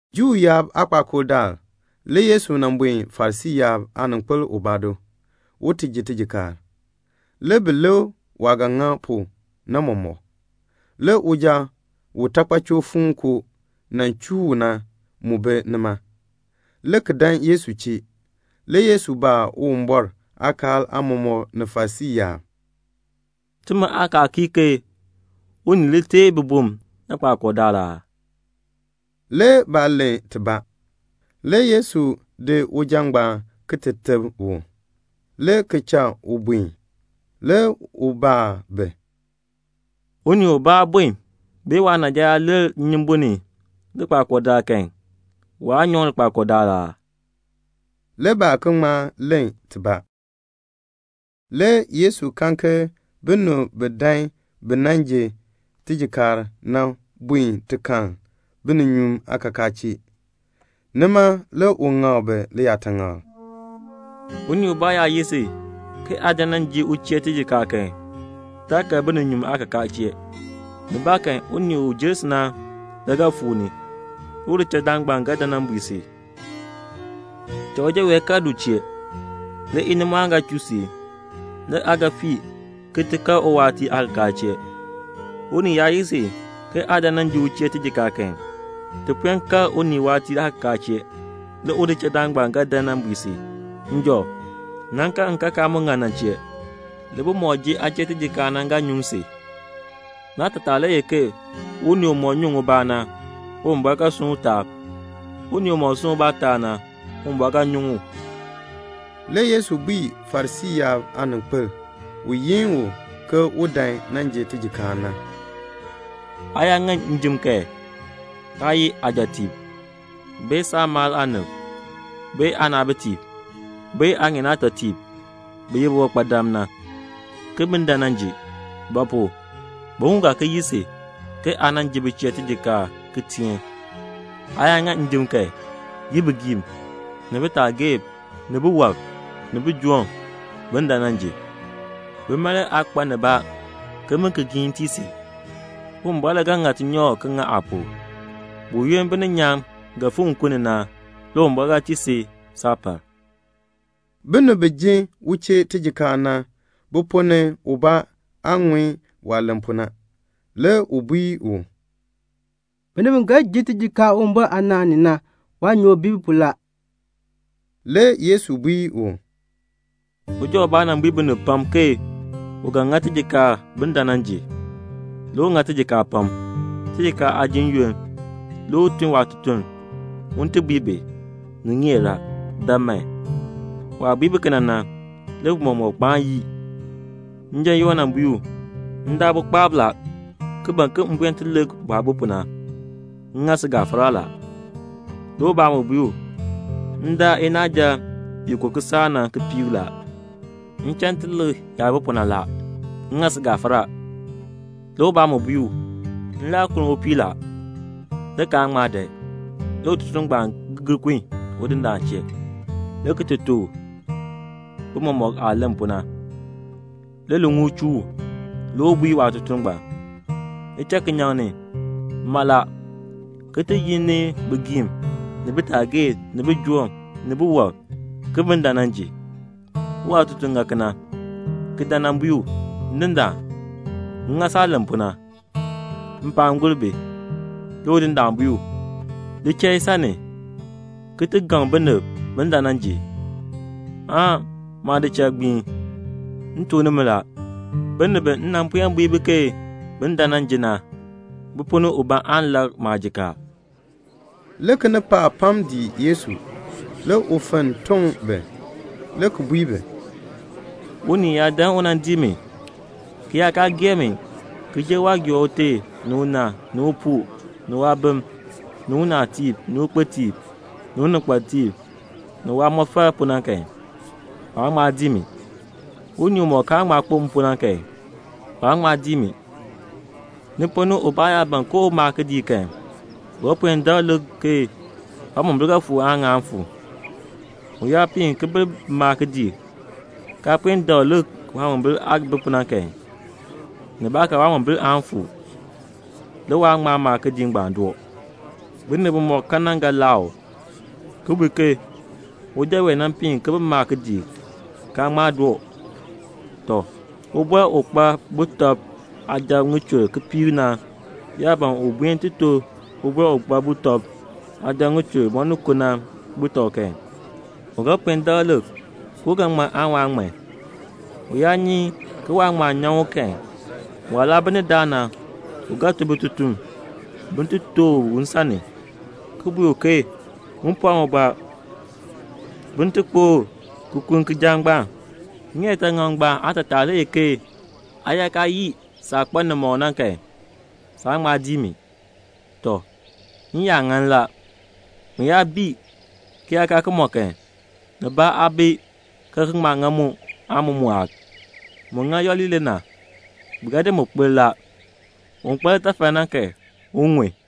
Juu yaab aakpakool daal le Yesu nan buen Farisii yaab aaninkpil ubaa do, un ti ji tijikaar. Le bi lik waah ga ŋa pu na mɔmɔk. Le uja u taakpachoo fuukoo nan chuu u na, mu bi nima, le ki dan Yesu chee. Le Yesu baa Uwumbɔr aakaal aamɔmɔkb ni Farisii yaab, "Timi aakaal kii ke unii li teei bibum likpakool daal aa?" Le baa len tibaa. Le Yesu di uja ngbaan ki ti teb u, le ki cha u buen. Le u baa bi, "Unii ubaa aabon bee waanaaja yaa lir nnyumbun ni likpakool daal kan, waan nyan u likpakool daal aa?" Le baa ki ŋma len tibaa. Le Yesu kan ke binib bi dan bi nan ji tijikaar na buen ti kal bininyuun aakakaa chee. Nima le u ŋak bi liyaataŋakl, "Unii ubaa yaa yi si ke aa dan nan ji u chee tijikaar kan, taa kal bininyuun aakakaa chee. Nibaakan unii u jer si na le ga fuu ni. Le udichaldaan ngbaan ga dan nan bui si, 'Cha uja wee kal du chee.' Le inimɔɔn ga chuu si. Le aa ga fii ki ti kal uwaatiir aakakaa chee. Unii yaa yi si ke aa dan nan ji u chee tijikaar kan, ti puen kal uwaatiir aakakaa chee. Le udichaldaan ngbaan ga dan nan bui si, 'Njɔ, nan kal nkakaa mu ŋan na chee.' Le bimɔk ji aa chee tijikaar na ga nyuŋ si. Naatataa le ye ke unii umɔk nyuŋ ubaa na, Uwumbɔr ga sunn u taab. Unii umɔk sunn ubaa taab na, Uwumbɔr ga nyuŋ u." Le Yesu bui Farisii yaab aaninkpil u yin u ke u dan nan ji tijikaar na, "Aa yaa ŋa njim kan, taa yi aajɔtiib, bee aamaal aanib, bee aanaabitiib, bee aaŋeen aatɔtiib bi ye biwankpadam na, ke bin dan nan ji; ba pu? bi mu ga ki yi si ke aa ji bi chee tijikaar, ki giin tii si. Aa yaa ŋa njim kan, yim bigiim, ni bitaagee, ni biwɔb, ni bijoom, bin dan nan ji. Bima le aa kpa nibaa ke bin ki giin tii si. Uwumbɔr le ga ŋa tinyoor ki ŋa aa pu. Buyoonn bininyaan ga fikr nkun ni na, le Uwumbɔr ga tii si saapal." Binib bi ji u chee tijikaar na, bi ponn ni ubaa aah ŋun waah len pu na, le u bui u, "Binib bi ga ji tijikaar Uwumbɔr aanaan ni na, waanyoor bi bi pu la." Le Yesu bui u, "Uja ubaa nan bui binib pam ke u ga ŋa tijikaar bin dan nan ji. Le u ŋa tijikaar pam. Tijikaar aajim yoonn, le u tun waatutuln un ti bui bi, 'Ni ŋeer a. Dan man.' Waah bui bi kena na, le bi mɔmɔk kpaan yii. Njan yoo le bui u, 'M daa bukpaab la, ki ban ke m buen ti lik bu aah bi pu na. M ŋa si gafara la.' Le ubaa mu bui u, 'M daa inaaja i ko kisaak na kipiik la. M cha m ti lik yaah bi pu na la. M ŋa si gafara.' Le ubaa mu bui u, 'M kunn mpuu la, le kaan ŋma dan.' Le ututuln ngbaan gir kun udindaan chee, le ki tuk u bi mɔmɔk aah len pu na. Le liŋuul chuu u. Le u bui waatutuln, 'Li cha kinyaŋ ni mala, ki ti li joo ni bigiim, ni bitaagee, ni bijoom, ni biwɔb, ke bin dan nan ji.' Le waatutuln ŋa kena, le ki dan nan bui u, 'Ndindaan, m ŋa saah len pu na. Mpaan gur bi.' Le udindaan bui u, 'Li cha isan ni, ki gaŋ binib bin dan nan ji, aan maadichal gbii. M tuk nimi la, binib bi m nan puen bui bi ke bin dan nan ji na, bi ponn ni ubaa aan lak maajikaar."' Le kinipaak pam dii Yesu. Le u fenn toŋ bi, le ki bui bi, "Unii yaa dan u nan dii mi, ki yaa kaa gee mi ki jer waah gee ute ni una, ni upuu, ni waabim, ni unaatiib ni ukpitiib, ni uninkpatiib, ni waamɔfal pu na kan, waan ŋma dii mi. Unii umɔk kaan ŋma kpo m pu na kan, waan ŋma dii mi. Ni ponn ni ubaa yaa ban ke un maa kidiik kan, u ga puen dakl lik ke waamombil ga fuu aan ŋaan fuu. U yaa piin ki bi maa kidiik, kaa puen dakl lik waamombil aah bi pu na kan, nibaakan waamombil aan fuu. Le waan ŋma maa kidiik ngbaan doo. Binib bimɔk kan na ga laa u, ki bui ke 'Uja ngbaan nan piin ki bi maa kidiik, kaan ŋma doo.' Tɔ, ubɔr u kpa sujatiib ŋichur kipiik na yaa ban un buen ti to ubɔr u kpa sujatiib ŋichur moninko na butɔb kan, u ga puen dakl lik ke u ga ŋman aan waan ŋman. U yaa nyi ke waan ŋman nyaŋ u kan, waah laa bi ni daa na, u ga tun bitutum bin ti tooh u nsan ni, ki bui u ke un pɔɔ ubaa bin ti kpokl ki kulni kijaak ngbaan. Ŋiyaataŋak ngbaan aatataa le ye ke aa yaa kaa yii saah kpa nimɔk na kan, saan ŋma dii mi." "Tɔ, n-yaan ŋan la. Mu yaa bii, ki yaa kaa ki mɔ kan, nibaa aa bi ki ga ki ŋma ŋa mu aan mu mɔɔk. Mu ŋa yooli le na. Bi ga di kpir la. Un kpa litafal na kan, un ŋun."